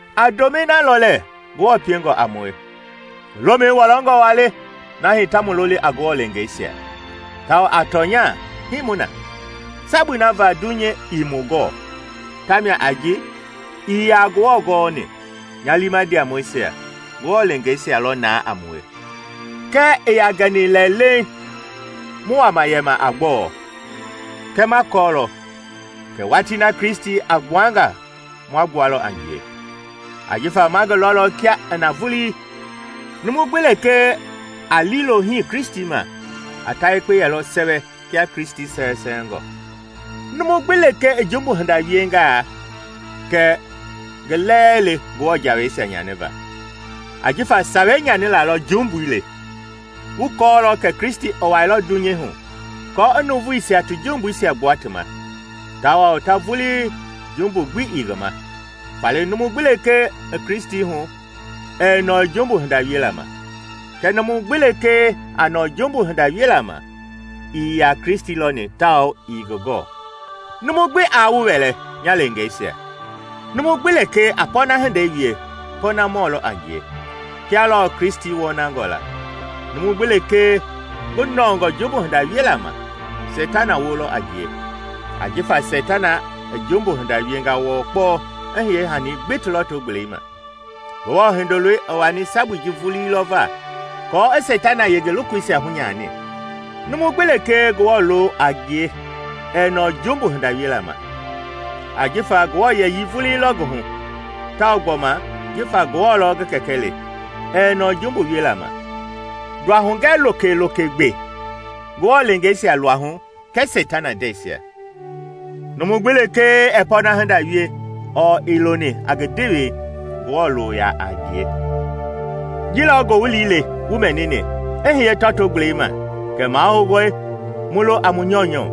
A ndomɛi na lɔ lɛɛ Ngewɔ piengɔ a mue! Ngi lomɛi wɔlɔngɔ waa le na hii ta mu loli a Ngewɔ leengeisia, tawao a tɔnya hii mu na. Sabui na va dunyei ii mu gɔɔ, tamia a ji ii yaa Ngewɔ gɔɔni. Nya liima ndiamɔisia, Ngewɔ leengeisia lɔ naa a mue, kɛɛ ii yaa gɛni lɛ leiŋ mu wama yɛma a gbɔɔ. Kɛɛ ma kɔɔlɔ kɛ watii na Kristi a gbuanga ma gbualɔ a ngie, ajifa ma ngi lɔlɔ kia i na vulii. Numu gbi lekee a liilo hii Kristi ma, a ta yekpe yɛlɔ sɛwɛ kia Kristi sɛwɛsɛwɛngɔ. Numu gbi lekee i jumbu hinda wiengaa, kɛ ngi lɛɛ le Ngewɔ jawei nyaniva; ajifa sawei nyanila lɔ jumbui le. Wu kɔɔlɔ kɛ Kristi i wailɔ dunyei hu aako i nuuvuisia ti jumbuisia gbua ti ma, tawao ta vulii jumbu gbi ii ngi ma. Faale numu gbi lekee i Kristi hu ɛɛ nɔɔ jumbu hinda wiela ma; kɛɛ numu gbi lekee a nɔɔ jumbu hinda wiela ma ii yaa Kristi lɔni tawao ii ngi gɔɔ. Numu gbi aa wu wɛlɛ, nya leengeisia! Numu gbi lekee a pɔɔna hindei wie, pɔɔnamɔ lɔ a ngie, kia lɔɔ Kristi wɔnangɔ la. Numu gbi lekee ngi nɔɔngɔ jumbu hinda wiela ma, Seitana wolɔ a ngie, ajifa Seitana i jumbu hinda wienga wɔɔ kpɔɔ i hiye hanii gbi ti lɔto-gbelei ma. Ngewɔ Hindoloi i wani sabui ji vulii lɔ va, aako i Seitana yenge lokoisia hunyani. Numu gbi lekee Ngewɔ loo a ngie ɛɛ nɔɔ jumbu hinda wiela ma, ajifa Ngewɔ yɛyii vulii lɔ ngi hu, tawao gbɔma jifa Ngewɔ lɔ ngi Kɛkɛ le, ɛɛ nɔɔ jumbu wiela ma. Nduahugɛ lokeloke gbe Ngewɔ leengeisia luahu kɛɛ Seitana ndɛisia: numu gbi lekee ɛɛ pɔɔna hinda wie ɔɔ ii loni a ngi ndewei, Ngewɔ loo yaa a ngie. Ji lɔ ngowili le wu mɛnini i hiye tɔto-gbelei ma kɛ mahoungɔe mu lo a mu nyɔunyɔ,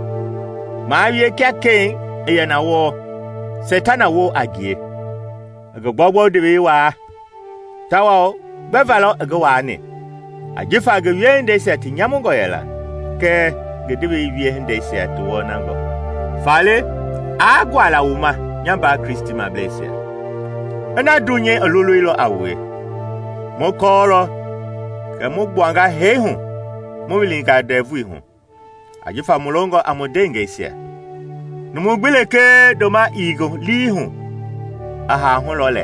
maa wie kia Ken i yɛ na wɔɔ, Seitana woo a ngie, i ngi gbɔugbɔu ndewei waa. Tawao gbɛva lɔ i ngi waani? Ajifa ngi wiehindeisia ti nyamungɔ yɛla, kɛɛ ngi ndewei wiehindeisia ti wɔnangɔ. Faale aa guala wu ma, nya mbaa Kristimableisia, ina dunyei i loleilɔ a wue. Mu kɔɔlɔ kɛ mu gbuanga hee hu mu wilinga ndɛvuihu, ajifa mu longɔ a mu ndeengɛisia. Numu gbi lekee ndoma ii ngi lii hu i haa hu lɔ lɛ.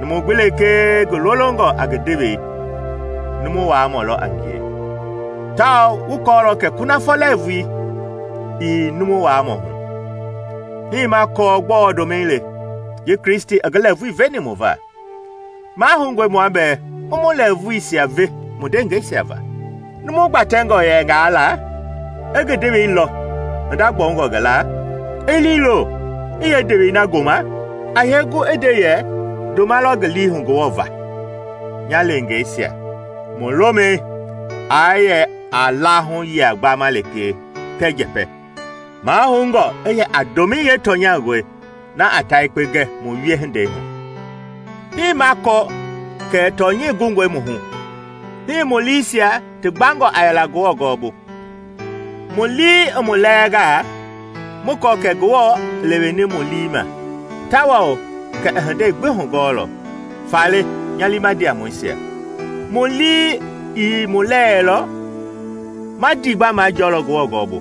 Numu gbi lekee ngi lolongɔ a ngi ndewei, numu waamɔ lɔ a ngie; tawao wu kɔɔlɔ kɛ kunafɔ lɛɛvui ii numu waamɔ hu. Hii ma kɔɔ gbɔɔ ndomɛi le: ji Kristi i ngi lɛɛvui veni mu va. Mahoungɔe mua bɛɛ mu mu lɛɛvuisia ve mu ndeengɛisia va! Numu gbatɛngɔ yɛngaa la, i ngi ndewei lɔ hinda gbɔungɔ ngi laa, i liilo i yeendewei na goma, a yee gu i nde yɛ ndoma lɔ ngi lii hu Ngewɔ va? Nya leengeisia, mu lomɛi aa yɛ a lahu layia gbama lekee kɛɛ njɛpɛ, mahoungɔ i yɛ a ndomɛi yeetɔnyangɔi na a ta yekpe gɛ mu wiehindei hu. Hii ma kɔɔ kɛ tɔnyɛi gungɔe mu hu, hii mu liisia ti gbangɔ a yɛla Ngewɔ gɔɔbu. Mu lii i mu lɛɛngaa, mu kɔɔ kɛ Ngewɔ i leweni mu lii ma, tawao kɛ i hindei gbi hugɔɔlɔ. Faale, nya liima ndiamɔisia, mu lii ii mu lɛɛlɔ, ma ndiigba majɔɔlɔ Ngewɔ gɔɔbu.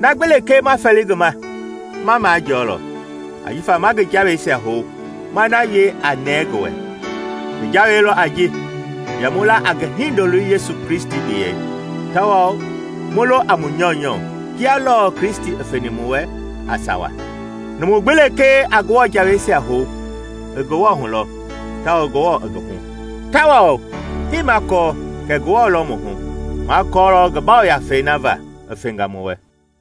Na gbi lekee ma fɛli ngi ma, ma majɔɔlɔ, ajifa ma ngi jaweisia hou, ma na wie a nɛɛ ngi wɛ. Ngi jawei lɔ a ji: yɛ mu la a ngi Hindoloi Yesu Kristi biyɛi, tawao mu lo a mu nyɔunyɔ, kia lɔɔ Kristi i feni mu wɛ a sawa. Numu gbi lekee a Ngewɔ jaweisia hou, i Ngewɔ hu lɔ, tawao Ngewɔ i ngi hu. Tawao hii ma kɔɔ kɛ Ngewɔ lɔ mu hu: ma kɔɔlɔ ngi Yafei na va i fenga mu wɛ.